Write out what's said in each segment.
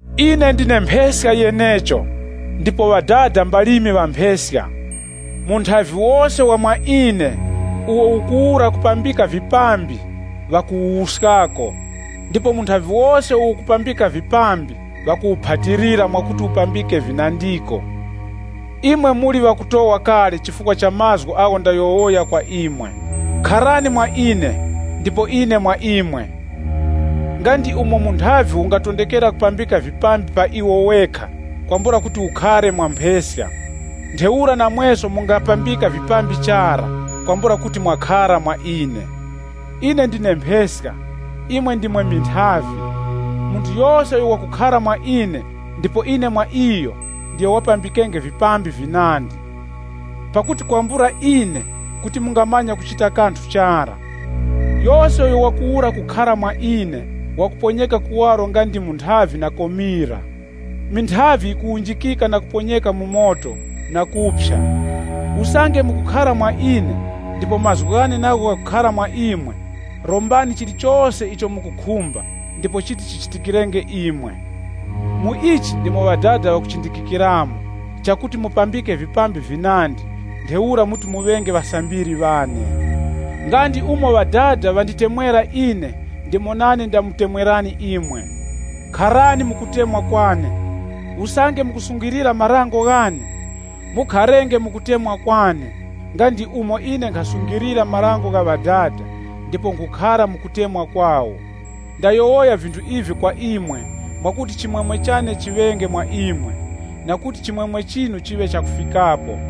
“Ine ndine mpheska yenecho, ndipo Ŵadada mbalimi ŵa mpheska. Munthavi wose wa mwa ine, uwo ukuwura kupambika vipambi ŵakuwuskako. Ndipo munthavi wose uwo ukupambika vipambi ŵakuwuphatilira mwakuti upambike vinandiko. Imwe muli ŵakutowa kale chifukwa cha mazgu agho ndayowoya kwa imwe. Kharani mwa ine, ndipo ine mwa imwe. Nga ndi umo munthavi ungatondekera kupambika vipambi pa iwo wekha kwambula kuti ukhare mwa mpheska, ntheura namweso mungapambika vipambi chara, kwambula kuti mwakhara mwa ine. “Ine ndine mpheska, imwe ndimwe minthavi. Munthu yose uyo wakukhara mwa ine ndipo ine mwa iyo, ndiyo wapambikenge vipambi vinandi. Pakuti kwambula ine, kuti mungamanya kuchita kanthu chara. Yose uyo wakuwura kukhara mwa ine wakuponyeka kuwaro nga ndi munthavi na komira. Minthavi yikuwunjikika na kuponyeka mu moto na kuphya. Usange mukukhara mwa ine, ndipo mazgu ghane nagho ghakukhara mwa imwe, rombani chilichose icho mukukhumba ndipo chiti chichitikirenge imwe. Mu ichi ndimo Ŵadada ŵakuchindikikiramo chakuti mupambike vipambi vinandi, ntheura muti muŵenge ŵasambiri ŵane. Nga ndi umo Ŵadada ŵanditemwera ine ndimo nane ndamutemwerani imwe. Kharani mu kutemwa kwane. Usange mukusungilira marango ghane, mukharenge mu kutemwa kwane nga ndi umo ine nkhasungilira marango gha Ŵadada ndipo nkhukhara mu kutemwa kwawo. “Ndayowoya vinthu ivi kwa imwe mwakuti chimwemwe chane chiŵenge mwa imwe, na kuti chimwemwe chinu chiŵe chakufikapo.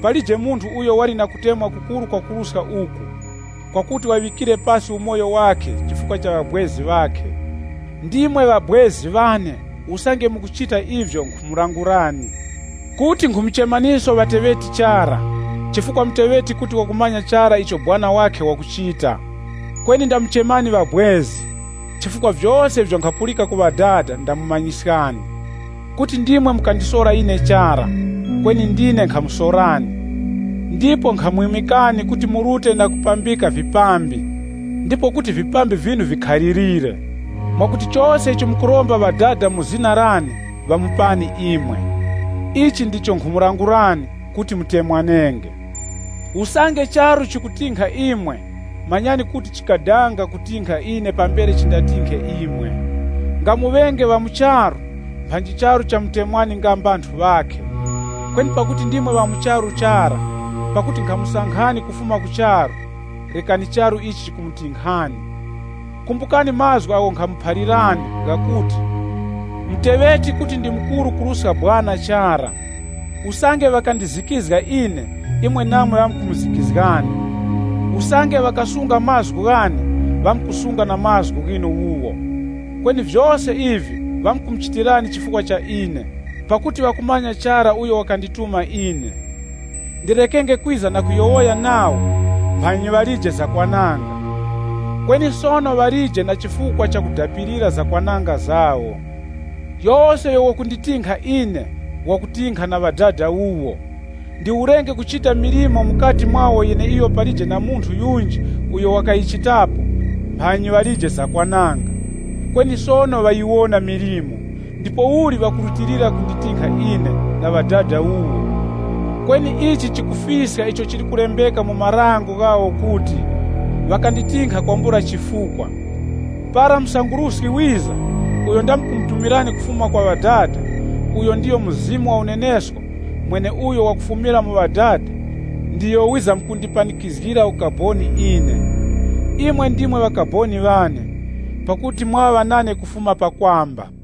Palije munthu uyo wali na kutemwa kukuru kwakuruska uku, kwakuti waŵikire pasi umoyo wakhe chifukwa cha ŵabwezi ŵakhe. Ndimwe ŵabwezi ŵane usange mukuchita ivyo nkhumulangulani. Kuti nkhumuchemaniso ŵateŵeti chara, chifukwa muteŵeti kuti wakumanya chara icho sekuru wakhe wakuchita. Kweni ndamuchemani ŵabwezi, chifukwa vyose ivyo nkhapulika ku Ŵadada ndamumanyiskani. Kuti ndimwe mukandisora ine chara, kweni ndine nkhamusorani, ndipo nkhamwimikani kuti murute na kupambika vipambi, ndipo kuti vipambi vyinu vikhalirire. Mwakuti chose icho mukuromba Ŵadada mu zina lane ŵamupani imwe. Ichi ndicho nkhumulangulani kuti, ‘Mutemwanenge.’ “Usange charu chikutinkha imwe, manyani kuti chadanga kutinkha ine pambere chindatinkhe imwe. Nga muŵenge ŵa mu charu, mphanyi charu chamutemwani nga mbanthu ŵakhe. Kweni pakuti ndimwe ŵa mu charu chara, pakuti nkhamusankhani kufuma mu charu, rekani charu ichi chikumutinkhani. Kumbukani mazgu agho nkhamuphalirani, ghakuti, ‘Muteŵeti kuti ndi mukuru kuruska sekuru chara.’ Usange ŵakandizikizga ine, imwe namwe ŵamkumuzikizgani. Usange ŵakasunga mazgu ghane, ŵamkusunga na mazgu ghinu wuwo. Kweni vyose ivi, ŵamkumuchitirani chifukwa cha ine, pakuti ŵakumanya chara uyo wakandituma ine. Ndirekenge kwiza na kuyowoya nawo, mphanyi ŵalije zakwananga. Kweni sono ŵalije na chifukwa cha kudapilira zakwananga zawo. Yose uyo wakunditinkha ine, wakutinkha na Ŵadada wuwo. Ndiwurenge kuchita milimo mukati mwawo yeneiyo palije na munthu yunji uyo wakayichitapo, mphanyi ŵalije zakwananga. Kweni sono ŵayiwona milimo, ndipouli, ŵakurutilira kunditinkha ine na Ŵadada wuwo. Kweni ichi chikufiska icho chili kulembeka mu marango ghawo kuti, ‘Ŵakanditinkha kwambula chifukwa.’ “Para Msanguruski wiza, uyo ndamkumutumirani kufuma kwa Ŵadada, uyo ndiyo Mzimu wa unenesko, mweneuyo wakufumira mu Ŵadada, ndiyo wizamkundipanikizgira ukaboni ine. Imwe ndimwe ŵakaboni ŵane, pakuti mwaŵa nane kufuma pakwamba.